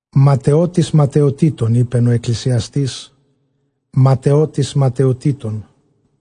Ματαιότης ματαιοτήτων, εἶπεν ὁ Ἐκκλησιαστὴς, ματαιότης ματαιοτήτων,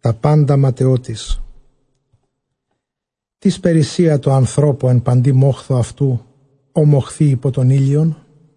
τὰ πάντα ματαιότης. Τίς περίσσεια τῷ ἀνθρώπῳ ἐν παντὶ μόχθῳ αὐτοῦ ᾧ μοχθεῖ ὑπὸ τὸν ἥλιον;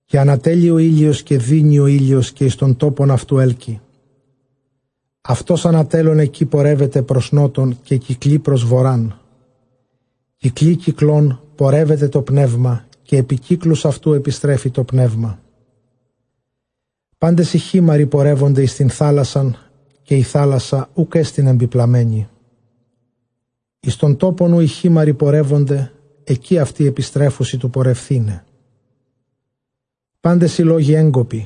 Καὶ ἀνατέλλει ὁ ἥλιος καὶ δύνει ὁ ἥλιος καὶ εἰς τὸν τόπον αὐτοῦ ἕλκει· αὐτὸς ἀνατέλλων ἐκεῖ πορεύεται πρὸς Νότον, καὶ κυκλοῖ πρὸς Βοῤῥᾶν· κυκλοῖ κυκλῶν πορεύεται τὸ πνεῦμα, καὶ ἐπὶ κύκλους αὐτοῦ ἐπιστρέφει τὸ πνεῦμα. Πάντες οἱ χείμαῤῥοι πορεύονται εἰς τὴν θάλασσαν, καὶ ἡ θάλασσα οὐκ ἔστιν ἐμπιμπλαμένη· εἰς τὸν τόπον οὗ οἱ χείμαῤῥοι πορεύονται, ἐκεῖ αὐτοὶ ἐπιστρέφουσι τοῦ πορευθῆναι. Πάντες οἱ λόγοι ἔγκοποι,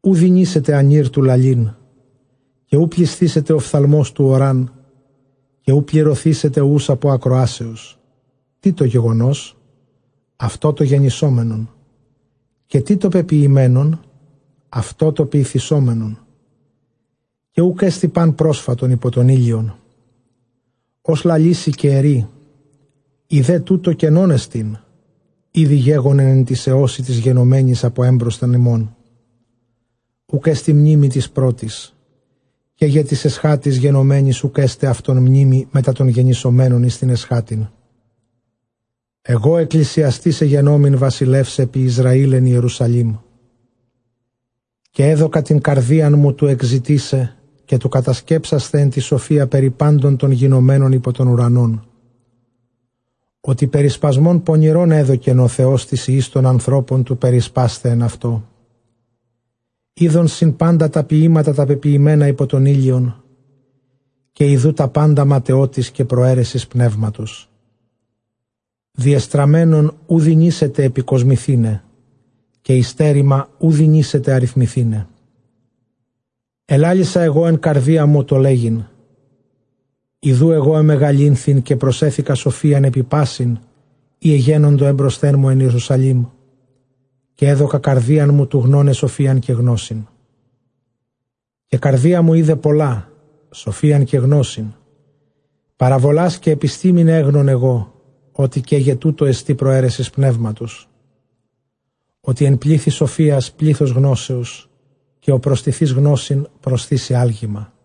οὐ δυνήσεται ἀνὴρ τοῦ λαλεῖν· καὶ οὐ πλησθήσεται ὀφθαλμὸς τοῦ ὁρᾷν, καὶ οὐ πληρωθήσεται οὖς ἀπὸ ἀκροάσεως. Τί τὸ γεγονός; αὐτὸ τὸ γενησόμενον· καὶ τί τὸ πεποιημένον; αὐτὸ τὸ ποιηθησόμενον· καὶ οὐκ ἔστι πᾶν πρόσφατον ὑπὸ τὸν ἥλιον. Ὃς λαλήσει καὶ ἐρεῖ, ἴδε τοῦτο καινόν ἐστιν; ἤδη γέγονεν ἐν τοῖς αἰῶσι τοῖς γενομένοις ἀπὸ ἔμπροσθεν ἡμῶν. Οὐκ ἔστι μνήμη τοῖς πρώτοις, καί γε τοῖς ἐσχάτοις γενομένοις οὐκ ἔσται αὐτῶν μνήμη μετὰ τῶν γενησομένων εἰς τὴν ἐσχάτην. Ἐγὼ ἐκκλησιαστὴς ἐγενόμην βασιλεὺς ἐπὶ Ἰσραὴλ ἐν Ἱερουσαλήμ. Καὶ ἔδωκα τὴν καρδίαν μου τοῦ ἐκζητῆσαι καὶ τοῦ κατασκέψασθαι ἐν τῇ σοφίᾳ περὶ πάντων τῶν γινομένων ὑπὸ τὸν οὐρανόν, ὅτι περισπασμὸν πονηρὸν ἔδωκεν ὁ Θεὸς τοῖς υἱοῖς τῶν ἀνθρώπων τοῦ περισπᾶσθαι ἐν αὐτῷ. Εἶδον σύμπαντα τὰ ποιήματα τὰ πεποιημένα ὑπὸ τὸν ἥλιον· καὶ ἰδοὺ τὰ πάντα ματαιότης καὶ προαίρεσις πνεύματος. Διεστραμμένον οὐ δυνήσεται ἐπικοσμηθῆναι, καὶ ὑστέρημα οὐ δυνήσεται ἀριθμηθῆναι. Ἐλάλησα ἐγὼ ἐν καρδίᾳ μου, τῷ λέγειν, ἰδοὺ ἐγὼ ἐμεγαλύνθην, καὶ προσέθηκα σοφίαν ἐπὶ πᾶσιν οἳ ἐγένοντο ἔμπροσθέν μου ἐν Ἱερουσαλήμ· καὶ ἔδωκα καρδίαν μου τοῦ γνῶναι σοφίαν καὶ γνῶσιν. Καὶ καρδία μου εἶδε πολλὰ, σοφίαν καὶ γνῶσιν, παραβολὰς καὶ ἐπιστήμην· ἔγνων ἐγώ ὅτι καί γε τοῦτό ἐστι προαίρεσις πνεύματος· Ὅτι ἐν πλήθει σοφίας πλῆθος γνώσεως, καὶ ὁ προστιθεὶς γνῶσιν, προσθήσει ἄλγημα.